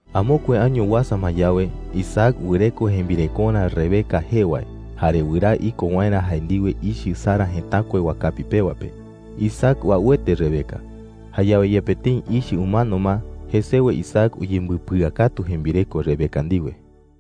Amokue año uasa ma yawe, Isaac wɨreko jembirekorä Rebeca jee wae, jare wɨraa iko waerä jae ndiwe ichɨ Sara jëtakue wakapi pewa pe. Isaac uauete Rebeca. Jayawe yepe tëi ichɨ umano ma, jesewe Isaac uyembɨpɨakatu jembireko Rebeca ndiwe.